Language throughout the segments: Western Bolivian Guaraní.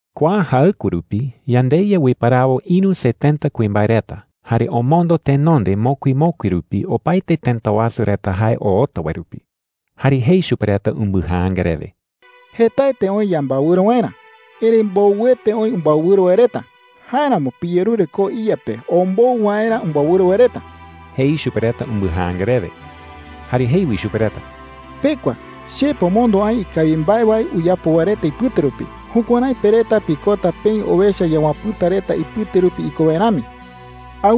Kua jaɨkue rupi yandeYa uiparawo ïru setenta kuimbae reta jare omondo tenonde mokui mokui rupi opaete tëta wasu reta jae oota wae rupi. Jare jei chupe reta umbɨjaanga rewe: “Jetaete oï yambaewɨro waerä, erëi mbowɨete oï umbaewɨro wae reta. Jáeramo piyerure koo iYa pe ombou waerä umbaewɨro wae reta,” jei chupe reta umbɨjaanga rewe. Jare jei wi chupe reta: “Pekua. Che pomondo aï ikawi mbae wae uyapo wae reta ipɨte rupi. Jukuärái pe reta pikota peï owecha yawapɨ̈ta reta ipɨte rupi iko wae rami,” jei chupe reta.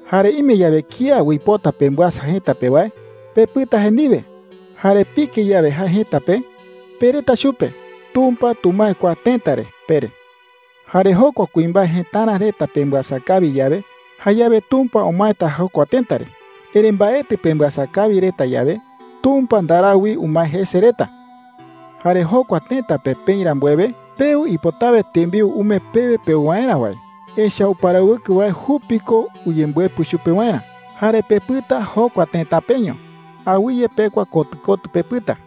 “Jare ime yawe kía uipota pembɨasa jëta pe wae, pepɨta jae ndiwe. Jare pike yawe jae jëta pe, pereta chupe: ‘Tumpa tumae kua tëta re,’ pere. Jare jokua kuimbae jëtara reta pembɨasa kawi yawe, jayawe Tumpa umaeta jokua tëta re. Erëi mbaetɨ pembɨasa kawi reta yawe, Tumpa ndarau wi umae jese reta,” jei chupe reta. “Jare jokua tëta pe peï rambuewe, peu ipotawe tembiu umee pewe peu waerä wae. Echa’ä uparawɨkɨ wae jupi ko uyembɨepɨ chupe waerä. Jare pepɨta jokua tëta peño. Awɨye pekua kotɨ kotɨ pepɨta,” jei Jesús chupe reta.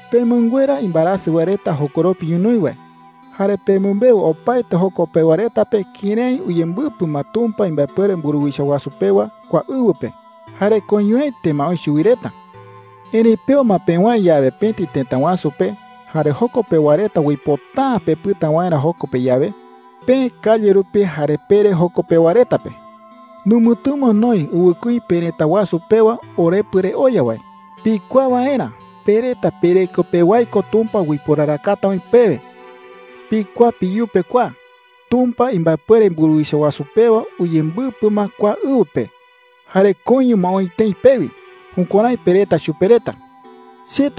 “Pemɨnguera imbaerasɨ wae reta jokoropi ñonoï wae. Jare pemɨmbeu opaete joko pewa reta pe kërái uyembɨpɨ ma Tumpa imbaepuere mburuwicha wasu pewa kua ɨwɨ pe, jare koiñoete ma oï chuwi reta,” jei chupe reta. “Erëi peo ma pewäe yawe pëti tëta wasu pe, jare joko pewa reta uipota’ä pepɨta waerä joko pe yawe, peë calle rupi jare pere joko pewa reta pe: ‘Numɨtɨmo noï ɨwɨkuí perëta wasu pewa orepɨ re oya wae, pikuaa waerä pe reta pereko pewái ko Tumpa uiporarakata oï pewe. Pikuaa peyupe kua: Tumpa imbaepuere mburuwicha wasu pewa uyembɨpɨ ma kua ɨwɨ pe jare koiño ma oï tëi pewi.’ Jukuärái pereta chupe reta,” jei.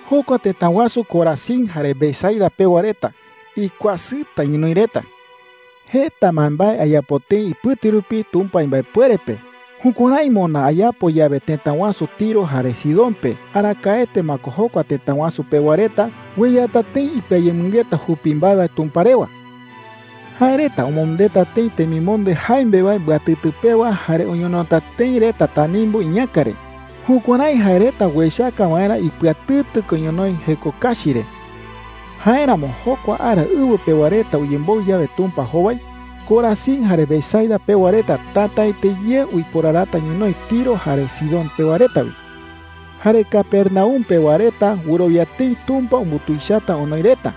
“Jokua tëta wasu Corazín jare Betsaida pewa reta, ¡ikuasɨta ñonoï reta!” jei. “Jeta mbaembae ayapo tëi ipɨte rupi Tumpa imbaepuere pe. Jukuärái moná ayapo yawe tëta wasu Tiro jare Sidón pe, arakaete ma ko jokua tëta wasu pewa reta ueyata tëi ipɨayemɨngeta jupi mbae wae Tumpa rewa,” jei. “Jae reta omondeta tëi temimonde jaimbe wae mbɨatɨtɨ pewa jare oñonota tëi reta tanimbu iñäka re, jukuärái jae reta uechaka waerä ipɨatɨtɨ ko ñonoï jeko kachi re,” jei. “Jáeramo jokua ara ɨwɨ pewa reta uyemboɨ yawe Tumpa jowai, Corazín jare Betsaida pewa reta tätaete ye uiporarata ñonoï Tiro jare Sidón pewa reta wi,” jei. “Jare Capernaum pewa reta wɨrowia tëi Tumpa umbutuichata onoi reta.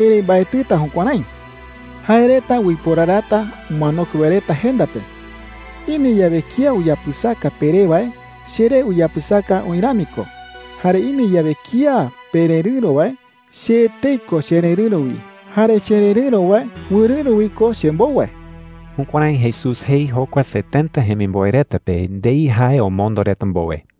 Erëi mbaetɨta jukuärái,” jei. “Jae reta uiporarata umanokue wae reta jenda pe,” jei. “Ime yawe kía uyapɨsaka peré wae, cheré uyapɨsaka oï rami ko. Jare ime yawe kía pererɨ̈ro wae, che etei ko chererɨ̈ro wi. Jare chererɨ̈ro wae, wɨrɨ̈ro wi ko chembou wae.” Jukuärái Jesús jei jokua setenta jemimboe reta pe ndei jae omondo reta mbowe.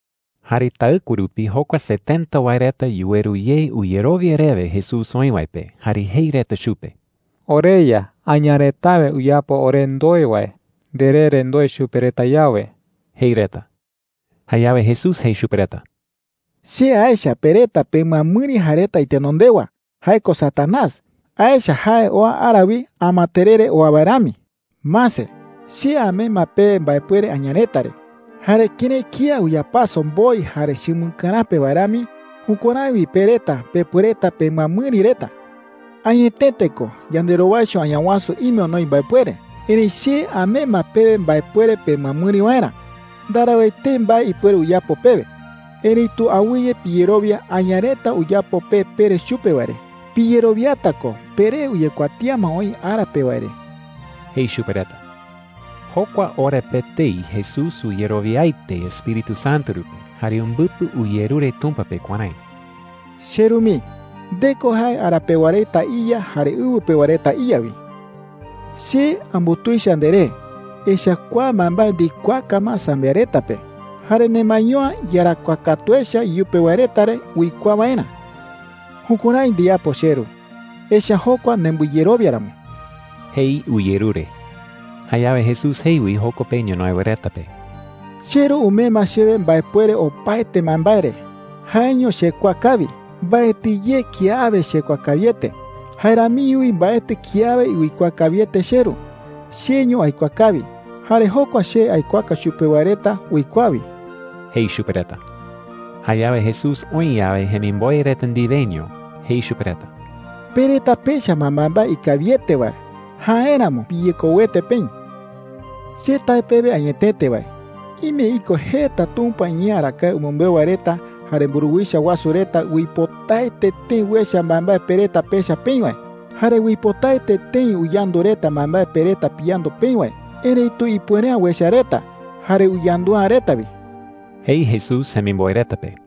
Jare taɨkue rupi jokua setenta wae reta yuweru ye uyerowia rewe Jesús oï wae pe, jare jei reta chupe: “OreYa, aña retawe uyapo ore ndoe wae, nderee re ndoe chupe reta yawe,” jei reta. Jayawe Jesús jei chupe reta: “Che aecha pe reta pemɨamɨri jae reta itenondewa – jae ko Satanás. Añawasu jee ko Satanás. Aecha jae oa ara wi amaterere oa wae rami,” jei. “Mase, che amee ma pewe mbaepuere aña reta re. Jare kërái kía uyapaso mboi jare chumɨkaräpe Amokue wae jei chupe charakaka. wae rami, jukuärái wi pe reta pepuereta pemɨamɨri reta,” jei. “Añetete ko, yanderowaicho Añawasu ime onoi mbaepuere. Erëi che amee ma pewe mbaepuere pemɨamɨri waerä. Ndarau etei mbae ipuere uyapo pewe,” jei. “Erëitu awɨye piyerowia aña reta uyapo pe pere chupe wae re. Piyerowiata ko peree uyekuatía ma oï ara pe wae re,” jei chupe reta. Jokua ora pe etei Jesús uyerowiaete Espíritu Santo rupi jare umbɨpɨ uyerure Tumpa pe kuärái: “CheRu mii, nde ko jae ara pewa reta iYa jare ɨwɨ pewa reta iYa wi,” jei. “Che ambutuicha nderee, echa’ä kua mbaembae ndikuaaka ma sambiaɨ reta pe, jare nemaeño’ä iyarakuaa katu echa iyupe wae reta re uikuaa waerä,” jei. “Jukuärái ndiyapo, cheRu, echa’ä jokua nembɨyerowia ramo,” jei uyerure. Jayawe Jesús jei wi joko pe ñonoï wae reta pe: “CheRu umee ma chewe mbaepuere opaete mbaembae re. Jaeño chekuaa kawi. Mbaetɨ ye kiawe chekuaa kawiete. Jae ramiño wi mbaetɨ kiawe uikuaa kawiete cheRu. Cheño aikuaa kawi. Jare jokua che aikuaaka chupe wae reta uikuaa wi,” jei chupe reta. Jayawe Jesús oï yawe jemimboe reta ndiweño, jei chupe reta: “Pe reta pecha ma mbaembae ikawiete wae. Jáeramo piyekouete peï,” jei. “Che tae pewe añetete wae, ime iko jeta Tumpa iñee arakae umɨmbeu wae reta jare mburuwicha wasu reta uipotaete tëi uecha mbaembae pe reta pecha peï wae, jare uipotaete tëi uyandu reta mbaembae pe reta piyandu peï wae. Erëitu ipuere’ä uecha reta, jare uyandu’ä reta wi,” jei Jesús jemimboe reta pe.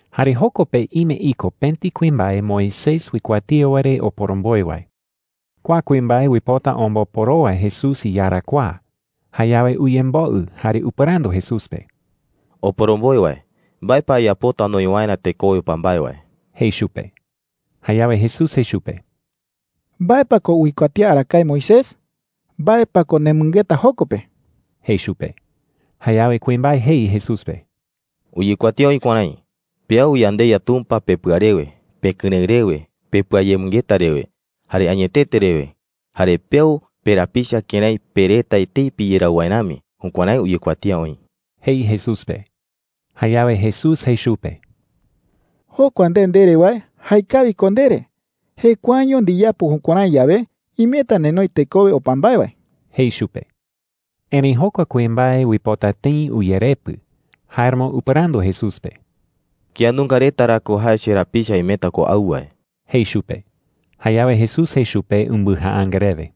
Jare joko pe ime iko pëti kuimbae Moisés uikuatía wae re oporomboe wae. Kua kuimbae uipota omboporowa Jesús iyarakuaa. Jayawe uyemboɨ jare upɨrandu Jesús pe: “Oporomboe wae, ¿mbae pa ayapota anoi waerä tekowe opa mbae wae?” jei chupe. Jayawe Jesús jei chupe: “¿Mbae pa ko uikuatía arakae Moisés? ¿Mbae pa ko nemɨngeta joko pe?” jei chupe. Jayawe kuimbae jei Jesús pe: “Uyekuatía oï kuärái: ‘Peau yandeYa Tumpa pepɨa rewe, pekɨrëɨ rewe, pepɨayemɨngeta rewe, jare añetete rewe.’ Jare, ‘peau perapicha kërái pe reta etei piyerau wae rami.’ Jukuärái uyekuatía oï,” jei Jesús pe. Jayawe Jesús jei chupe: “Jokua nde ndere wae, jaekawi ko ndere. Jekuaeño ndiyapo jukuärái yawe, imeta nenoi tekowe opa mbae wae,” jei chupe. Erëi jokua kuimbae uipota tëi uyerepɨ. Jáeramo upɨrandu Jesús pe: “¿Kía nunga reta ra ko jae cherapicha imeta ko au wae?” jei chupe. Jayawe Jesús jei chupe umbɨjaanga rewe: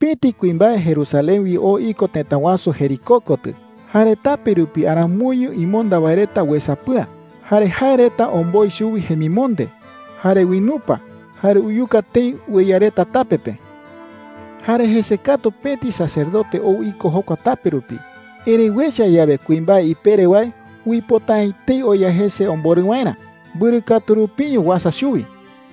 “Pëti kuimbae Jerusalén wi oo iko tëta wasu Jericó kotɨ. Jare tape rupi aramoiño imonda wae reta uesapɨa. Jare jae reta omboi chuwi jemimonde, jare uinupa, jare uyuka tëi ueya reta tape pe,” jei. “Jare jese katu pëti sacerdote ou iko jokua tape rupi. Erëi uecha yawe kuimbae ipere wae, uipota’ä etei oya jese omborɨ waerä. Mbɨrɨ katu rupiño uasa chuwi,” jei.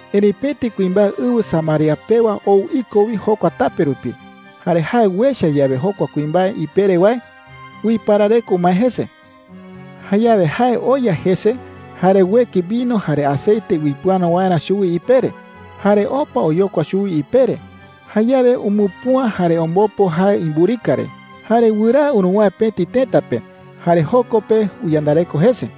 “Erëi pëti kuimbae ɨwɨ Samaria pewa ou iko wi jokua tape rupi. Jare jae uecha yawe jokua kuimbae ipere wae, uiparareko umae jese,” jei. “Jayawe jae oya jese, jare ueki vino jare aceite uipɨano waerä chuwi ipere, jare opa oyokua chuwi ipere. Jayawe umupüa jare ombopo jae imburika re, jare wɨraa uruwäe pëti tëta pe. Jare joko pe uyandareko jese,” jei.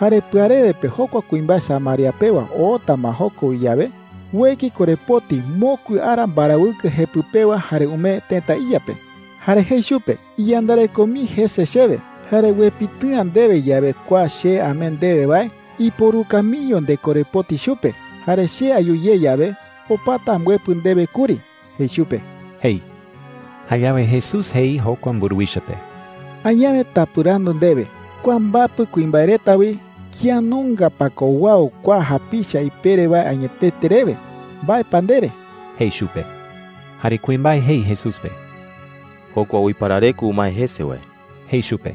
“Jare pɨarewe pe jokua kuimbae Samaria pewa oota ma joko wi yawe, ueki korepoti mokui ara mbarawɨkɨ jepɨ pewa jare umee tëta iya pe. Jare jei chupe: ‘Iyandareko mii jese chewe. Jare uepitɨ'ä ndewe yawe kua che amee ndewe wae, iporuka miño ndekorepoti chupe. Jare che ayu ye yawe, opata ambɨepɨ ndewe kuri,’ jei chupe,” jei. Jayawe Jesús jei jokua mburuwicha pe: “Añawe tapɨrandu ndewe: Kua mbapɨ kuimbae reta wi, ¿kía nunga pa ko uau kua japicha ipere wae añetete rewe? ¿Mbae pa ndere?” jei chupe. Jare kuimbae jei Jesús pe: “Jokua uiparareko umae jese wae,” jei chupe.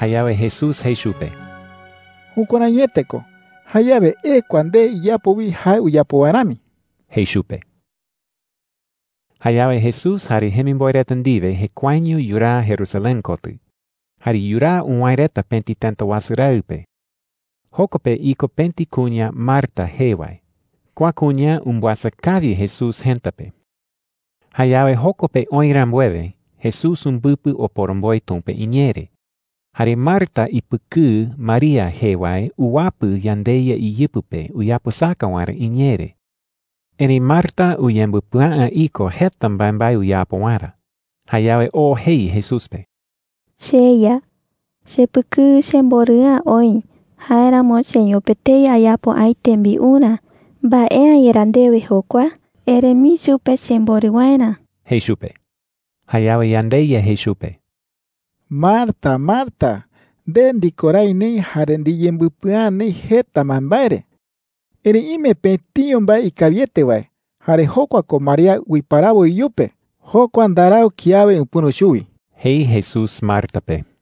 Jayawe Jesús jei chupe: “Jukuäraiete ko. Jayawe ekua nde, iyapo wi jae uyapo wae rami,” jei chupe. Jayawe Jesús jare jemimboe reta ndiwe jekuaeño yuraa Jerusalén kotɨ. Jare yuraa uwäe reta pëti tëta wasu raɨ pe. Joko pe iko pëti kuña Marta jee wae. Kua kuña umbɨasa kawi Jesús jëta pe. Jayawe joko pe oï rambuewe, Jesús umbɨpɨ oporomboe Tumpa iñee re. Jare Marta ipɨkɨɨ María jee wae uwapɨ yandeYa iyɨpɨ pe uyapɨsaka waerä iñee re. Erëi Marta uyembɨpɨa’ä iko jeta mbaembae uyapo waerä. Jayawe oo jei Jesús pe: “CheYa,” jei. “Chepɨkɨɨ chemborɨ'ä oï. Jáeramo cheño pe etei ayapo aï tembiurä. ¿Mbae’ä yerá ndewe jokua? Ere mii chupe chemborɨ waerä,” jei chupe. Jayawe yandeYa jei chupe: “Marta, Marta, nde ndikorái neï jare ndiyembɨpɨa’ä neï jeta mbaembae re. Erëi ime pëtiño mbae ikawiete wae, jare jokua ko María uiparawo iyupe. Jokua ndarau kiawe upɨ̈ro chuwi,” jei Jesús Marta pe.